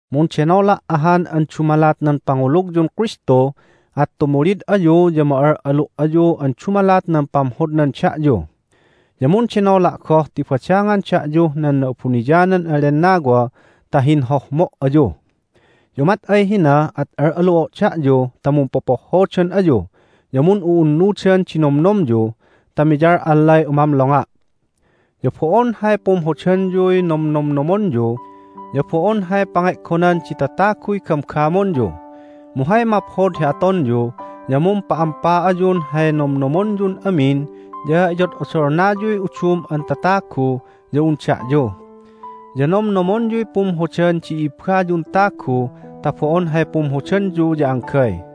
Mundenola' ahan an dumalat nan pangulugyun Kristu, at tumulid ayu ya ma'al'alu' ayu an dumalat nan pamhodnan da'yu. Ya mundenola' goh ti badangan da'yuh nan Na'abuniyanan an Lennawa ta hinhohmo' ayu. Ya umat ay hina at al'alu'o' da'yu ta mumpopohhodan ayu ya mun'u'unnudan di nomnomyu ta miyal'allay umamlonga'. Ya bo'on hay pumhodanyuy nomnomnomonyu, ya bo'on hay pange'gonan di tataguy gamgamonyu. Mu hay maphod hi atonyu ya mumpa'ampa ayun hay nomnomonyun amin ya iyod'odolnayuy udum an tatagu ya un da'yu. Ya nomnomonyuy pumhodan di i'ibbayun tagu ta bo'on hay pumhodanyu ya anggay.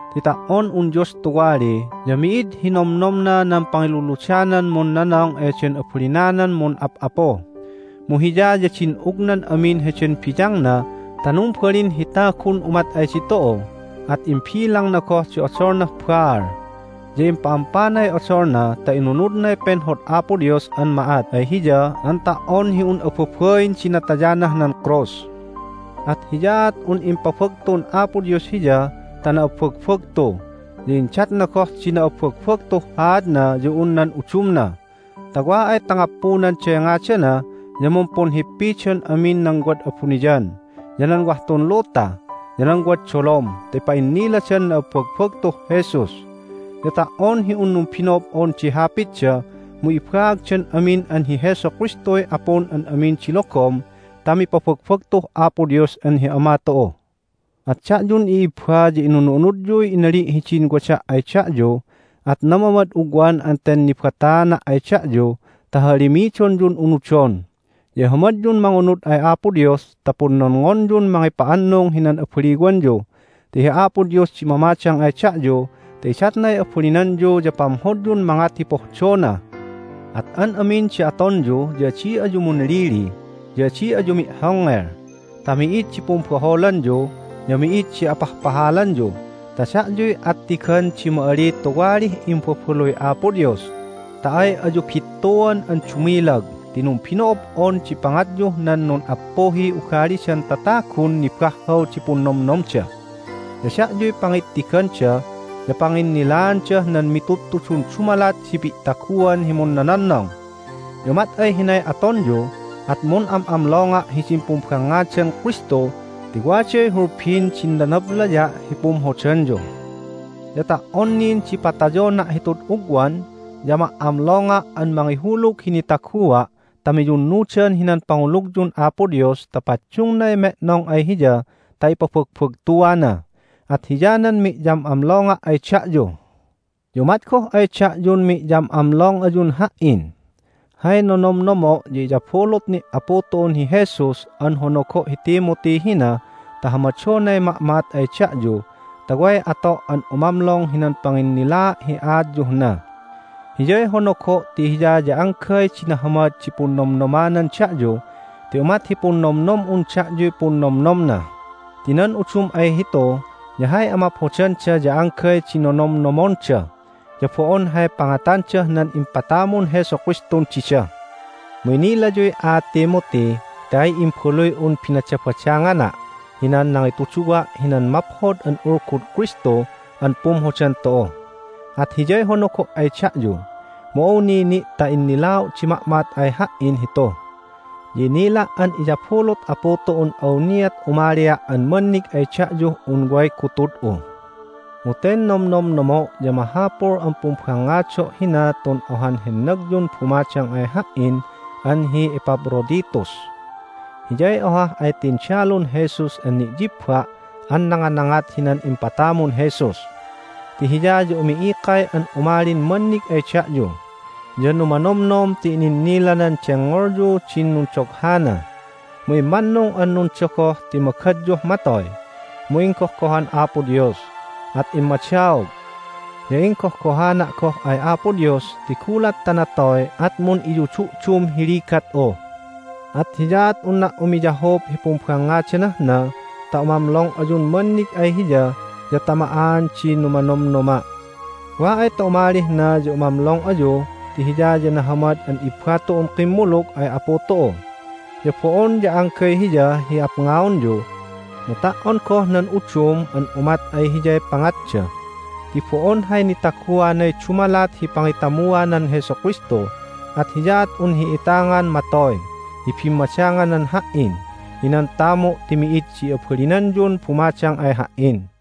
ti ta"on un Dios tuwali ya mi'id hi nomnomna nan pangiluludanan munnonong eden abalinanan mun'ap'apu. Mu Hiya ya din'ugnan amin heden biyangna ta numbalin hi tagun umat ay ditu'u, at imbilangna goh di odolnah baal. Ya impa'ampanay odolna ta inunudnay penhod Apo Dios an ma'at ay Hiya an ta"on hi un ababain di natayanah nan krus! At hiyaat un impabagtun Apo Dios Hiya ta na'abbagbagtu, ya indatna goh di na'abbagbagtuh haadna ya un nan udumna ta wa ay ta ngappundanday ngadana ya mumpunhippidan amin nan wad abuniyan, ya nan wah tun luta, ya nan wad dolom ta ipa'inniladan na'abbagbagtuh Jesus. Ya ta"on hi un numbino'ob'on di hapitda mu ibaagdan amin an hi Jesu Kristuy Apun an amin di logom ta mipabagbagtuh Apo Dios an hi Ama tu'u. At da'yun i'ibba ya inunu'unudyuy inali' hidin wada' ay da'yu, at namamad ugwan an ten nibataana' ay da'yu ta hahalimidonyun unudon. Ya ihamadyun mangunud ay Apo Dios ta punnonngonyun mangipa'annung hinan abaliwanyu ti hi Apo Dios di mamadang ay da'yu ta idatnay abalinanyu ya pamhodyun mangat hi pohdona. At an amin di atonyu ya adi ayu munlili, ya adi ayu mi'hongngel ta mi'id di pumbaholanyu, ya mi'id di apahpahalanyu ta da'yuy attigan di ma'ali tuwalih imbabaluy Apo Dios ta ay ayu bittuan an dumilag ti numbino'ob'on di pangatyuh nan nun'appuhiy ugalidan tatagun nibahhaw di punnomnomda. Ya da'yuy pangittiganda ya panginnilaandah nan mitudtudun dumalat di pi'taguan hi munnononnong. Ya umat ay hinay atonyu at mun'am'amlonga' hidin pumbangngadan Kristu ti waday hulbin din nanablaya' hi pumhodanyu. Ya ta"on nin di patayona' hitud ugwan ya ma"amlonga' an mangihulug hi nitagua' ta miyunnudan hinan pangulugyun Apo Dios ta paddungnay me'nong ay Hiya ta ipabagbagtuana. At hiyanan mi'yam'amlonga' ay da'yu. Ya umat goh ay da'yun mi'yam'amlong ayun ha"in. Hay nonomnomo' ya iyabulut ni' Apu tu'un hi Jesus an honogo' hi Timothy hina ta hamadonay ma'ma'at ay da'yu ta way ato' an umamlong hinan panginnilaa' hi aatyuh na. Hiyay honogo' ti hiya ya anggay di nahamad di punnomnomanan da'yu ti umat hi punnomnom'un da'yuy punnomnomna, ti nan udum ay hitu ya hay amaphodanda ya anggay di nonomnomonda, ya bo'on hay pangatandah nan impatamun Jesu Kristun dida. Mu inilayuy aat Timothy ti ay imbaluy'un binadabadangana' hinan nangitudduwa' hinan Maphod an Ulgud Kristu an pumhodan tu'u. At hiyay honogo' ay da'yu, mu awni ni' ta innilao' di ma'ma'at ay ha"in hitu. Ya inila' an iyabulut Apu tu'un awniat umalia' an mannig ay da'yuh un way gutud'u. Mu ten nomnomnomo' ya mahapul an pumbangngado' hina tun ohan hennagyun bumadang ay ha"in an hi Epaphroditus. Hiyay ohah ay tindalun Jesus an ni'yibba' an nanganangat hinan impatamun Jesus. Ti hiya ya umi'ikay an umalin mannig ay da'yu, ya numanomnom ti ininnilanan dengngolyu din nundoghana. Mu immannung an nundogoh ti magadyuh matoy, mu inggohgohan Apo Dios, at immadaog. Ya inggohgohana' goh ay Apo Dios ti gulat ta natoy at mun'iyudu'dum hi ligat'u. At hiyaat unna' umiyahup hi pumbangngadanah na ta umamlong ayun mannig ay hiya ya ta ma'aan di numanomnoma'. Wa ay ta umalih na ya umamlong ayu ti hiya ya nahamad an ibba tu'un kimmulug ay Apu tu'u. Ya bo'on ya anggay hiya hi apngaonyu, mu ta"on goh nan udum an umat ay hiyay pangatda ti bo'on hay nitaguanay dumalat hi pangitamuanan Jesu Kristu, at hiyaat un hi'itangan matoy hi bimmadanganan ha"in hinan tamu' ti mi'id di abalinanyun bumadang ay ha"in.